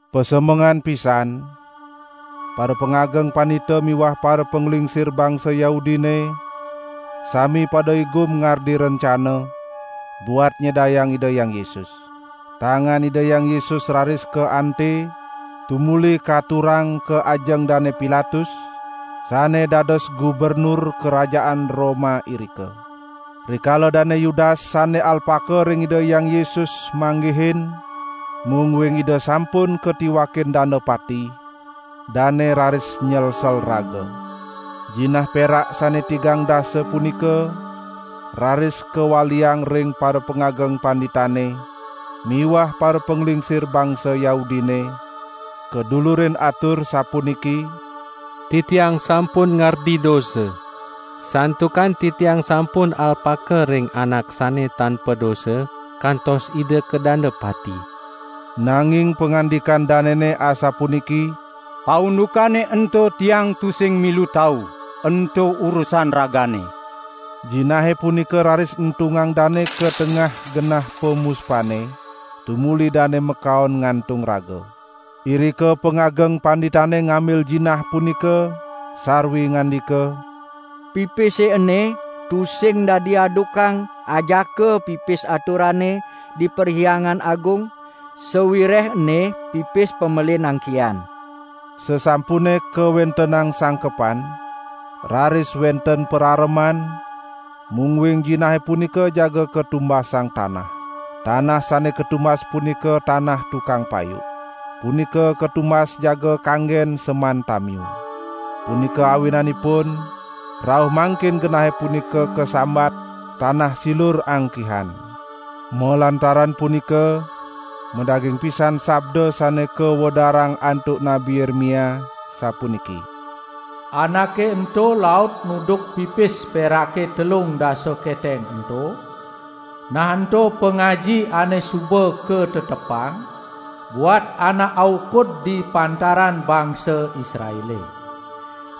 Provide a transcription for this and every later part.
Pasemengan pisan parapangageng pandita miwah parapanglingsir bangsa Yahudine sami pada igum ngardi rencana, buat nyedayang Ida Hyang Yesus. Tangan Ida Hyang Yesus raris kaante, tumuli katurang ka ajeng Dane Pilatus, sane dados gubernur kerajaan Roma irika. Rikala Dane Yudas sane alpaka ring Ida Hyang Yesus manggihin, mungguing Ida sampun katiwakin danda pati, dane raris nyelsel raga. Jinah perak sane tigang dasa punika raris kawaliang ring parapangageng panditane miwah parapanglingsir bangsa Yahudine, kadulurin atur sapuniki: "Titiang sampun ngardi dosa, santukan titiang sampun alpaka ring Anak sane tan padosa kantos Ida kadanda pati." Nanging pangandikan danene asapuniki: "Paundukane ento tiang tusing milu tau, ento urusan ragane." Jinahe punika raris entungang dane ka tengah genah pamuspane, tumuli dane makaon ngantung raga. Irika pangageng panditane ngambil jinah punika sarwi ngandika: "Pipise ene tusing dadi adukang ajaka pipis aturane di Perhyangan Agung, sawireh ene pipis pamelin angkihan." Sasampune kawentenang sangkepan, raris wenten parareman, mungguing jinahe punika jaga katumbasang tanah. Tanah sane katumbas punika tanah tukang payuk. Punika katumbas jaga kanggen seman tamiu. Punika awinanipun, rauh mangkin genahe punika kasambat: "Tanah silur angkihan". Malantaran punika madaging pisan sabda sane kawedarang antuk Nabi Yeremia sapuniki: "Anake ento laut nuduk pipis perake telung dasa keteng ento, nah ento pangaji ane suba katetepang buat anak aukud di pantaran bangsa Israele.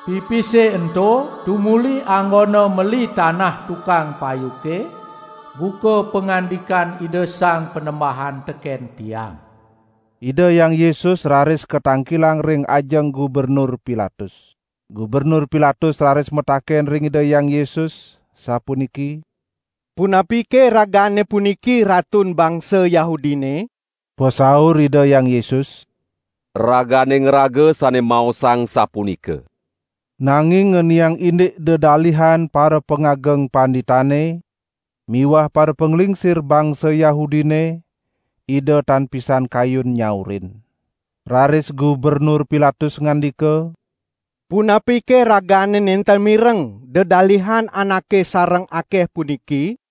Pipise ento tumuli anggona meli tanah tukang payuke buka pangandikan Ida Sang Panembahan teken tiang." Ida Hyang Yesus raris katangkilang ring ajeng Gubernur Pilatus. Gubernur Pilatus raris mataken ring Ida Hyang Yesus, sapuniki: "Punapike Ragane puniki Ratun bangsa Yahudine?" Pasaur Ida Hyang Yesus: "Ragane ngraga sane maosang sapunika." Nanging ngeniang indik dedalihan parapangageng panditane miwah parapanglingsir bangsa Yahudine Ida tan pisan kayun nyaurin. Raris Gubernur Pilatus ngandika: "Punapike Ragane nenten mireng dedalihan anake sareng akeh puniki?"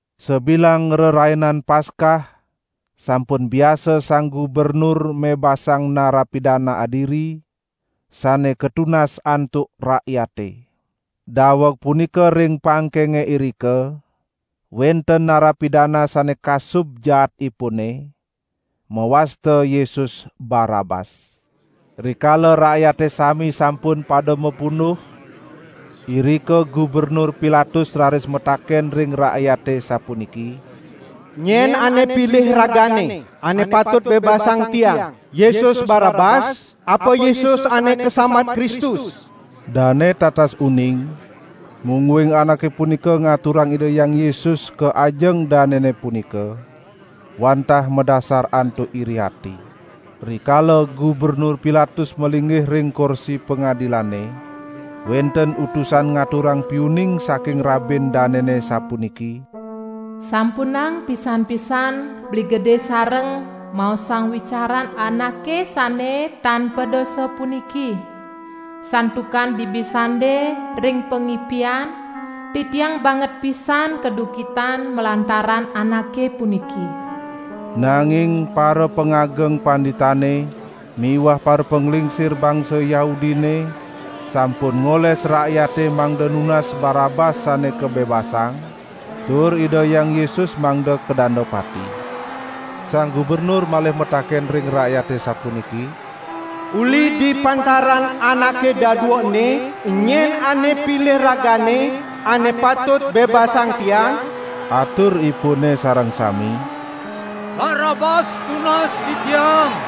Sabilang Rerainan Paskah sampun biasa sang gubernur mebasang narapidana adiri, sane katunas antuk rakyate. Daweg punika ring pangkenge irika wenten narapidana sane kasub jaatipune, mawasta Yesus Barabas. Rikala rakyate sami sampun pada mapunduh irika Gubernur Pilatus raris mataken ring rakyate sapuniki: "Nyen ane pilih ragane, ane patut bebasang tiang: Yesus Barabas apa Yesus ane kasambat Kristus?" Dane tatas uning, mungguing anake punika ngaturang Ida Hyang Yesus ka ajeng danene punika, wantah madasar antuk iri ati. Rikala Gubernur Pilatus malinggih ring korsi pangadilane, wenten utusan ngaturang piuning saking rabin danene sapuniki: "Sampunang pisan-pisan beli gede sareng maosang wicaran Anake sane tan padosa puniki, santukan dibi sande ring pangipian titiang banget pisan kaduhkitan malantaran Anake puniki." Nanging parapangageng panditane miwah parapanglingsir bangsa Yahudine sampun ngoles rakyate mangda nunas Barabas sane kabebasang tur Ida Hyang Yesus mangda kadanda pati. Sang gubernur malih mataken ring rakyate sapuniki: "Uli di pantaran anake dadua ene, enyen ane pilih ragane, ane patut bebasang tiang?" Aturipune sareng sami: "Barabas tunas titiang!"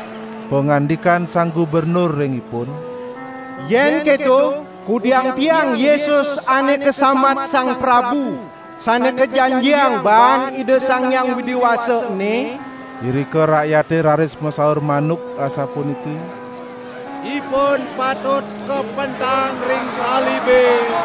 Pangandikan sang gubernur ring ipun: "Yen keto, kudiang tiang Yesus ane kasambat Sang Prabu Sane Kajanjiang baan Ida Sang Hyang Widi Wasa ene?" Irika rakyate raris masaur manuk asapuniki: "Ipun patut kapentang ring salibe!"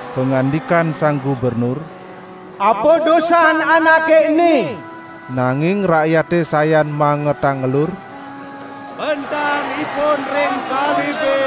Pangandikan sang gubernur: "Apa dosan Anake ene?" Nanging rakyate sayan mangetang ngelur: "Pentang Ipun ring salibe!"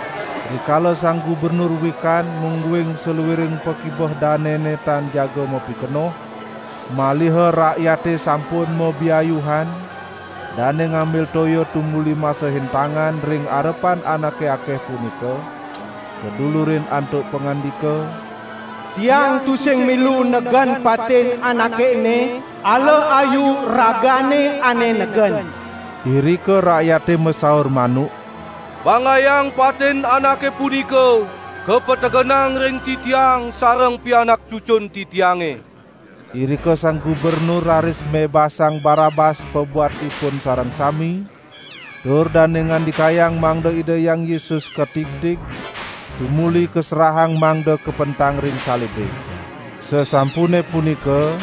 Rikala sang gubernur wikan mungguing saluiring pakibeh danene tan jaga mapikenoh, maliha rakyate sampun mabiayuhan, dane ngambil toya tumuli masehin tangan ring arepan anake akeh punika, kadulurin antuk pangandika: "Tiang tusing milu negen patin Anake ene, ala ayu ragane ane negen!" Irika rakyate masaur manuk: "Banggayang patin Anake punika kapetegenang ring titiang sareng pianak cucun titiange!" Irika sang gubernur raris mebasang Barabas pabuat ipun sareng sami, tur dane ngandikayang mangda Ida Hyang Yesus katigtig, tumuli kaserahang mangda kapentang ring salibe. Sasampune punika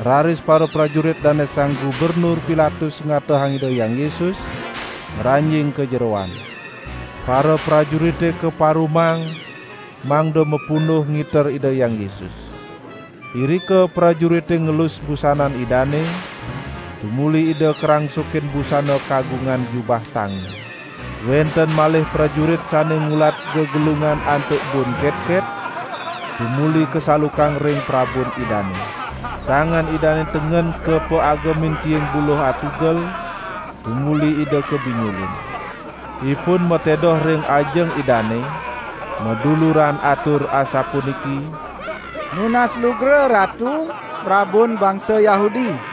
raris paraprajurit Dane Sang Gubernur Pilatus ngatehang Ida Hyang Yesus ngranjing ka jeroan. Paraprajurite kaparumang mangda mapunduh ngiter Ida Hyang Yesus. Irika prajurite ngelus busanan Idane, tumuli Ida karangsukin busana kagungan jubah tangi. Wenten malih prajurit sane ngulat gegelungan antuk bun ketket tumuli kasalukang ring prabun Idane. Tangan Idane tengen kapaagemin tiing buluh atugel tumuli Ida kabinjulin. Ipun matedoh ring ajeng Idane maduluran atur asapuniki: "Nunas lugra Ratu, Prabun Bangsa Yahudi!"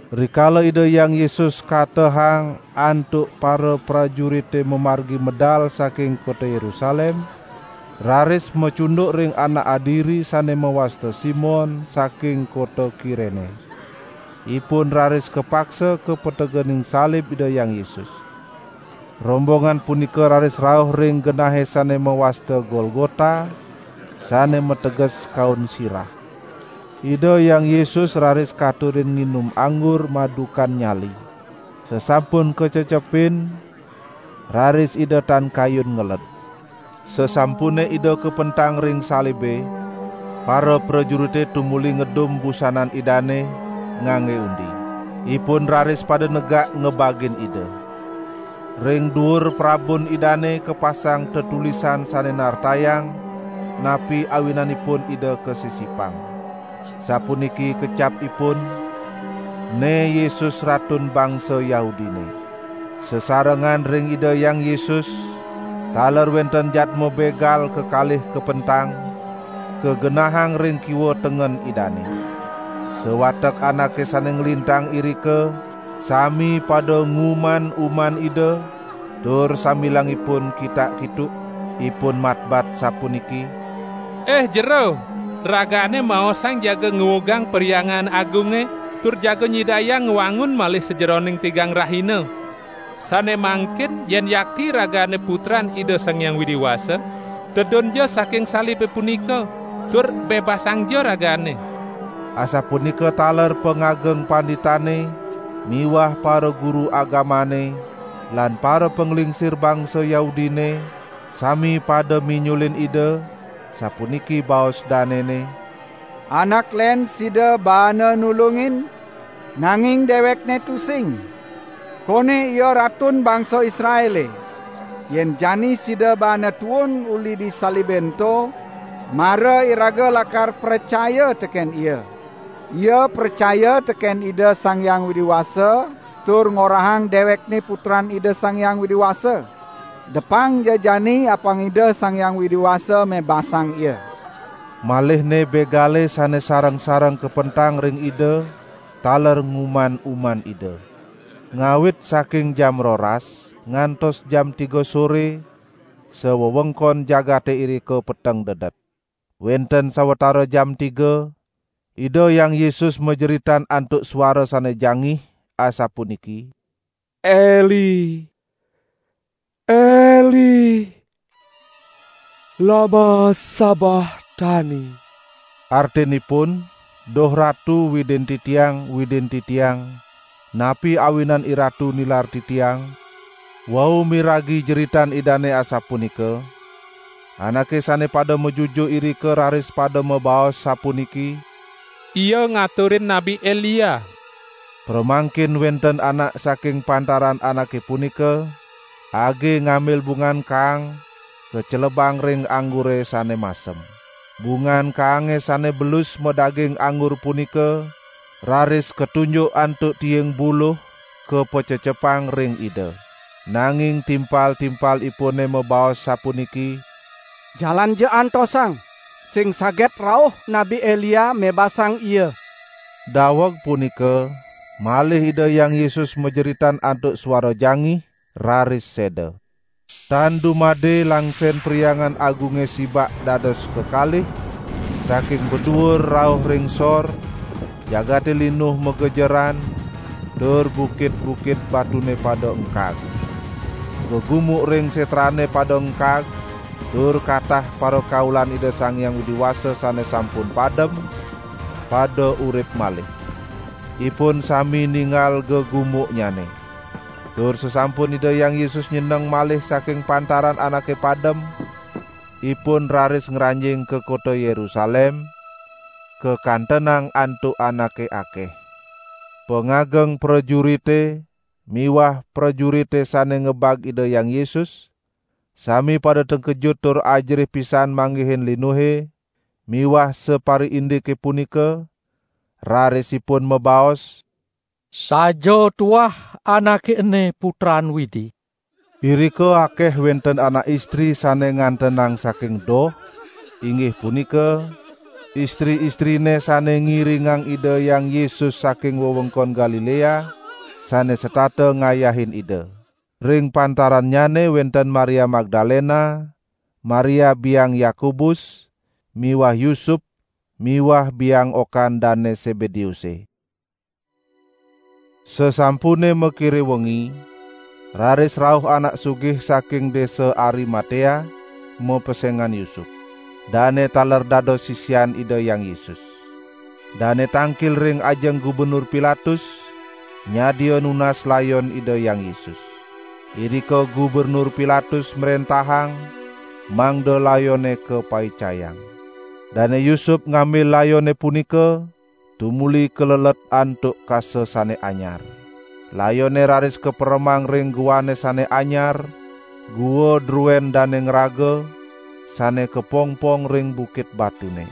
Rikala Ida Hyang Yesus katehang antuk paraprajurite mamargi medal saking kota Yerusalem, raris macunduk ring anak adiri sane mawasta Simon, saking kota Kirene. Ipun raris kapaksa kapategenin salib Ida Hyang Yesus. Rombongan punika raris rauh ring genahe sane mawasta Golgota, sane mateges: "Kaun Sirah". Ida Hyang Yesus raris katurin nginum anggur madukan nyali. Sasampun kacecepin, raris Ida tan kayun ngeled. Sasampune Ida kapentang ring salibe, paraprajurite tumuli ngedum busanan Idane, ngangge undi. Ipun raris pada negak ngebagin Ida. Ring duur prabun Idane kapasang tetulisan sane nartayang, napi awinanipun Ida kasisipang. Sapuniki kecapipun: "Ene Yesus Ratun Bangsa Yahudine". Sasarengan ring Ida Hyang Yesus taler wenten jadma begal kekalih kapentang, kagenahang ring kiwa tengen Idane. Sawatek anake sane nglintang irika sami pada nguman-uman Ida tur sambilang ipun kitak-kituk, ipun matbat sapuniki: "Ih Jero, Ragane maosang jaga nguugang Perhyangan Agunge tur jaga nyidayang ngwangun malih sajeroning tigang rahina. Sane mangkin yen yakti Ragane Putran Ida Sang Hyang Widi Wasa, tedunja saking salibe punika, tur bebasangja Ragane!" Asapunika taler pangageng panditane miwah paraguru agamane lan parapanglingsir bangsa Yahudine sami pada minjulin Ida, sapuniki baos danene: "Anak len sida baana nulungin, nanging dewekNe tusing! Kone Ia Ratun bangsa Israele! Yen jani sida baana tuun uli di salibe ento, mara iraga lakar pracaya teken Ia. Ia pracaya teken Ida Sang Hyang Widi Wasa tur ngorahang dewekNe Putran Ida Sang Hyang Widi Wasa. Depangja jani apang Ida Sang Hyang Widi Wasa mebasang Ia." Malihne begale sane sareng-sareng kapentang ring Ida taler nguman-uman Ida. Ngawit saking jam roras ngantos jam tiga sore sawewengkon jagate irika peteng dedet. Wenten sawatara jam tiga, Ida Hyang Yesus majeritan antuk suara sane jangih asapuniki: "Eli, Eli, lama sabahtani!" Artinipun: "Duh Ratu Widin Titiang, Widin Titiang, napi awinan IRatu nilar Titiang?" Wau miragi jeritan Idane asapunika anake sane pada majujuk irika raris pada mabaos sapuniki: "Ia ngaturin Nabi Elia." Pramangkin wenten anak saking pantaran anake punika age ngambil bungan kaang kacelebang ring anggure sane masem. Bungan kaange sane belus madaging anggur punika raris katunjuk antuk tiing buluh, kapacecepang ring Ida. Nanging timpal-timpalipune mabaos sapuniki: "Jalanja antosang, sing saget rauh Nabi Elia mebasang Ia." Daweg punika malih Ida Hyang Yesus majeritan antuk suara jangih, raris seda. Tan dumade langsen Perhyangan Agunge sibak dados kekalih, saking baduur rauh ring sor, jagate linuh magejeran, tur bukit-bukit batune pada engkag. Gegumuk ring setrane pada engkag, tur katah parakaulan Ida Sang Hyang Widi Wasa sane sampun padem, pada urip malih. Ipun sami ninggal gegumuknyane. Tur sasampun Ida Hyang Yesus nyeneng malih saking pantaran anake padem, ipun raris ngranjing ka kota Yerusalem, kakantenang antuk anake akeh. Pangageng prajurite miwah prajurite sane ngebag Ida Hyang Yesus sami pada tengkejut tur ajerih pisan manggihin linuhe miwah sapariindike punika, raris ipun mabaos: "Saja tuah Anake ene Putran Widi." Irika akeh wenten anak istri sane ngantenang saking doh, inggih punika: istri-istrine sane ngiringang Ida Hyang Yesus saking wewengkon Galilea, sane setata ngayahin Ida. Ring pantarannyane wenten Maria Magdalena, Maria biang Yakobus miwah Yusup miwah biang okan Dane Sebedeuse. Sasampune makire wengi, raris rauh anak sugih saking desa Arimatea, mapesengan Yusup. Dane taler dados sisian Ida Hyang Yesus. Dane tangkil ring ajeng Gubernur Pilatus nyadia nunas layon Ida Hyang Yesus. Irika Gubernur Pilatus mrentahang mangda layone kapaicayang. Dane Yusup ngambil layone punika tumuli kalelet antuk kasa sane anyar. Layone raris kaperemang ring guane sane anyar, gua druen dane ngraga, sane kapongpong ring bukit batune.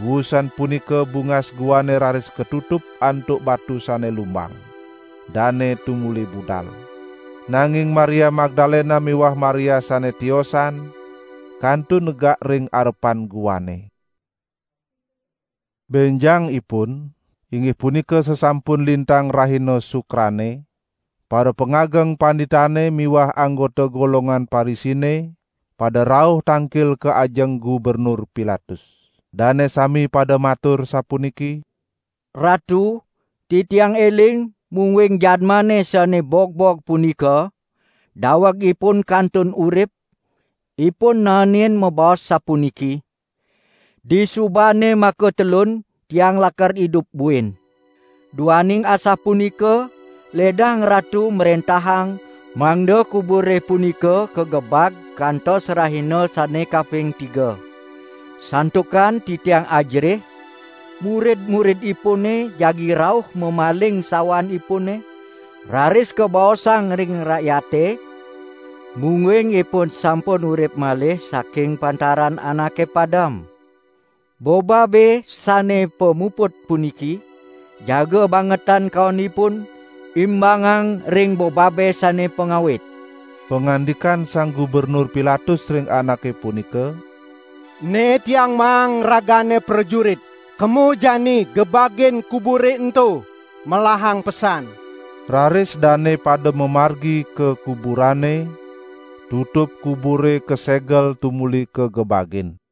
Wusan punika bungas guane raris katutup antuk batu sane lumbang. Dane tumuli budal. Nanging Maria Magdalena miwah Maria sane tiosan kantun negak ring arepan guane. Benjangipun, inggih punika sasampun lintang rahina Sukrane, parapangageng panditane miwah anggota golongan Parisine pada rauh tangkil ka ajeng Gubernur Pilatus. Dane sami pada matur sapuniki: "Ratu, titiang eling mungguing Jadmane sane bogbog punika daweg Ipun kantun urip, Ipun naenin mabaos sapuniki: 'Disubane makatelun Tiang lakar idup buin.' Duaning asapunika ledang ratu mrentahang mangda kubure punika kagebag kantos rahina sane kaping tiga. Santukan titiang ajerih, murid-muridipune jagi rauh mamaling sawan Ipune raris kabaosang ring rakyate, mungguing Ipun sampun urip malih saking pantaran anake padem. Bobabe sane pamuput puniki jaga bangetan kaonipun, imbangang ring bobabe sane pangawit." Pangandikan Sang Gubernur Pilatus ring anake punika: "Ne tiang maang ragane prajurit. Kemo jani gebagin kubure ento melahang pesan." Raris dane pada mamargi ka kuburane, tutup kubure kasegel tumuli kagebagin.